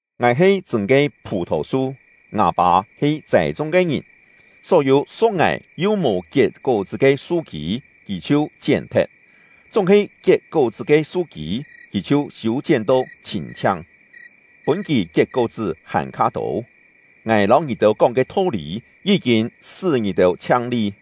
“Ngài he chṳ̂n ke phù-thò-su; ngâ Pâ he châi-chung ke ngìn. Só-yû su̍k ngài yu mò kiet kó-chṳ́ ke su-kî, Kì chhiu chién-thet; chúng-he kiet kó-chṳ́ ke su-kî, Kì chhiu siû-chién to chhîn-chhiang, pûn kì kiet kó-chṳ́ hàn-kha tô. Ngài lâu ngì-têu kóng ke tho-lî yí-kîn sṳ́ ngì-têu chhiang-li.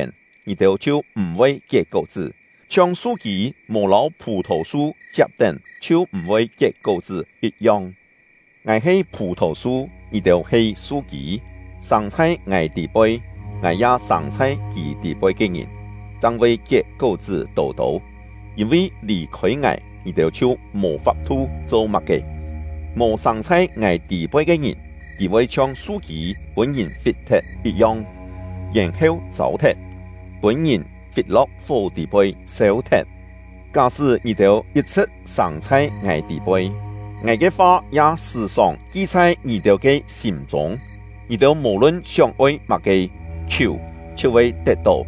chiet ya khiung-yong., ngài chhiu sâng chhai ngì-têu tî-poi. Na-he mò lâu ngài kiet-lièn, ngì-têu chhiu m̀-voi kiet kó-chṳ́, chhiong su-kî mò lâu phù-thò-su chiap-tén chhiu m̀-voi kiet kó-chṳ́ yit-yong. 5“Ngài he phù-thò-su; ngì-têu he su-kî. Sâng chhai ngài tî-poi, ngài ya sâng chhai kì tî-poi ke ngìn, chang voi kiet kó-chṳ́ tô-tô; yîn-vi lì-khôi ngài, ngì-têu chhiu mò fap-thu cho má-ke. 6Mò sâng chhai ngài tî-poi ke ngìn, kì voi chhiong su-kî pûn-ngìn fit-thet yit-yong, yèn-heu châu-thet, pûn-ngìn fit-lo̍k fó tî-poi sêu-thet. 7Ká-sṳ́ ngì-têu yit-chhṳ̍t sâng chhai ngài tî-poi, ngài ke fa ya sṳ̀-sòng ki chhai ngì-têu ke sîm-chûng, ngì-têu mò-lun sióng-oi má-ke, khiù, chhiu voi tet-tó.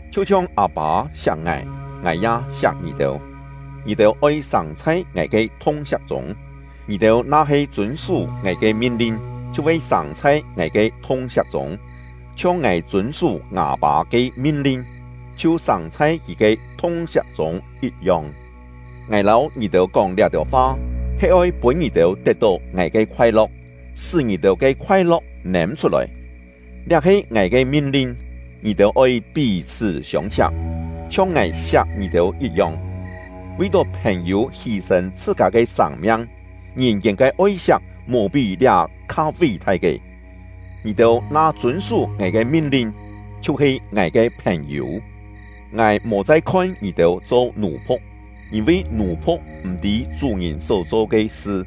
Chhiu-chhiong Â-pâ siak ngài, ngài ya siak ngì-têu; ngì-têu oi sâng chhai ngài ke thung-siak chûng. Ngì-têu na-he chûn-sú ngài ke min-lin, chhiu voi sâng chhai ngài ke thung-siak chûng, chhiong ngài chûn-sú ngâ Pâ ke min-lin, chhiu sâng chhai Kì ke thung-siak chûng yit-yong. “Ngài lâu ngì-têu kóng liá-têu fa, he oi pûn ngì-têu tet-tó ngài ke khoai-lo̍k, sṳ́ ngì-têu ke khoai-lo̍k nêm-chhut-lòi. Liá he ngài ke min-lin: Ngì-têu oi pí-chhṳ́ siông-siak, chhiong ngài siak ngì-têu yit-yong. Vi-tó phèn-yû hî-sên chhṳ-kâ ke sâng-miang, ngìn-kiên ke oi-siak mò pí liá kha ví-thai ke. Ngì-têu na chûn-sú ngài ke min-lin, chhiu-he ngài ke phèn-yû. Ngài mò chai khon ngì-têu cho nù-phu̍k, yîn-vi nù-phu̍k m̀-tî chú-ngìn só cho ke sṳ.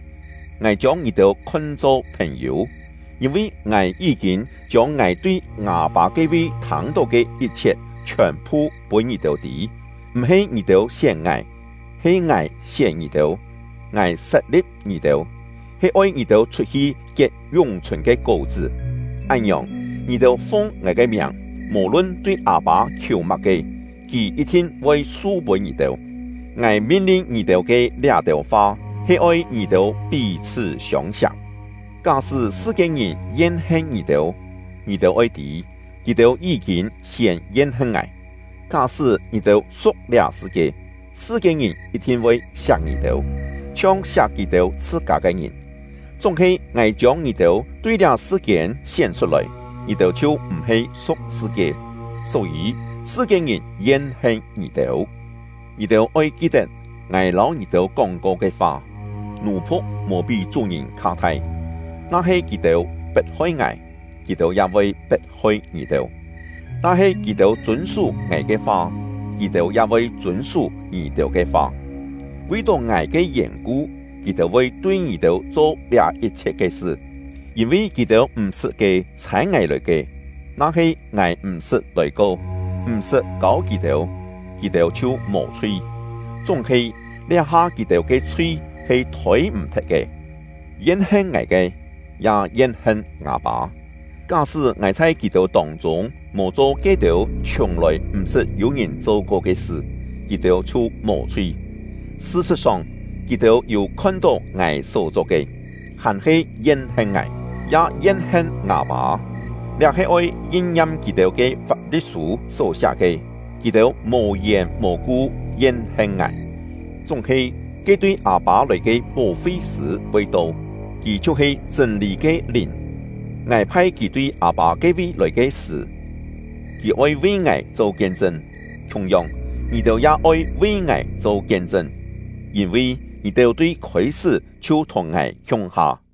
Ngài chiông ngì-têu khon-cho phèn-yû, yîn-vi ngài yí-kîn chiông ngài tui ngâ Pâ ke-vi thâng-tó ke yit-chhiet chhiòn-phu pûn ngì-têu tî. M̀-he ngì-têu sién ngài, he ngài sién ngì-têu. Ngài sat-li̍p ngì-têu, he oi ngì-têu chhut-hi kiet yún-chhùn ke kó-chṳ́. Án-ngiòng, ngì-têu fung ngài ke miàng, mò-lun tui Â-pâ khiù má-ke, Kì yit-thin voi su-pûn ngì-têu. Ngài min-lin ngì-têu ke liá-têu fa, he oi ngì-têu pí-chhṳ́ siông-siak. “Ká-sṳ́ sṳ-kiên-ngìn yen-hen ngì-têu, ngì-têu oi tî, kì-têu yí-kîn siên yen-hen ngài. Ká-sṳ́ ngì-têu su̍k liá sṳ-kie, sṳ-kiên-ngìn yit-thin voi siak ngì-têu, chhiong siak kì-têu chhṳ-kâ ke ngìn. Chúng-he ngài chiông ngì-têu tui liá sṳ-kiên sién chhut-lòi, ngì-têu chhiu m̀-he su̍k sṳ-kie; só-yî sṳ-kiên-ngìn yen-hen ngì-têu. Ngì-têu oi ki-tet ngài lâu ngì-têu kóng-ko ke fa: ‘Nù-phu̍k mò pí chú-ngìn kha thai.’ Na-he kì-têu pet-hoi ngài, kì-têu ya voi pet-hoi ngì-têu; na-he kì-têu chûn-sú ngài ke fa, kì-têu ya voi chûn-sú ngì-têu ke fa. Vi-tó ngài ke yèn-ku, kì-têu voi tui ngì-têu cho liá yit-chhiet ke sṳ, yîn-vi kì-têu m̀-sṳt ke ‘Chhâi ngài lòi ke.’ Na-he ngài m̀-sṳt lòi-ko, m̀-sṳt kâu kì-têu, kì-têu chhiu mò chhui; chúng-he, liá-ha kì-têu ke chhui he thôi-m̀-thet ke. Yen-hen ngài ke, ya yen-hen ngâ Pâ. Ká-sṳ́ ngài chhai kì-têu tông-chûng mò cho ke-têu chhiùng-lòi m̀-sṳt yû-ngìn cho-ko ke sṳ, kì-têu chhiu mò chhui. Sṳ-sṳ̍t-song, kì-têu yû khon-tó ngài só-cho ke, hàn-he yen-hen ngài, ya yen-hen ngâ Pâ. Liá he oi yin-ngiam kì-têu ke Fap-li̍t-sû só siá ke: ‘Kì-têu mò-yèn mò-ku yen-hen ngài!’ “Chúng-he, ke tui Â-pâ lòi ke Pó-fi-sṳ̂ voi to; Kì chhiu-he chṳ̂n-lî ke Lìn. Ngài phai Kì tui Â-pâ ke-vi lòi ke sṳ̀, Kì oi vi ngài cho kien-chṳn. Khiung-yong, ngì-têu ya oi vi ngài cho kien-chṳn, yîn-vi ngì-têu tui khôi-sṳ́ chhiu thùng ngài khiung-ha.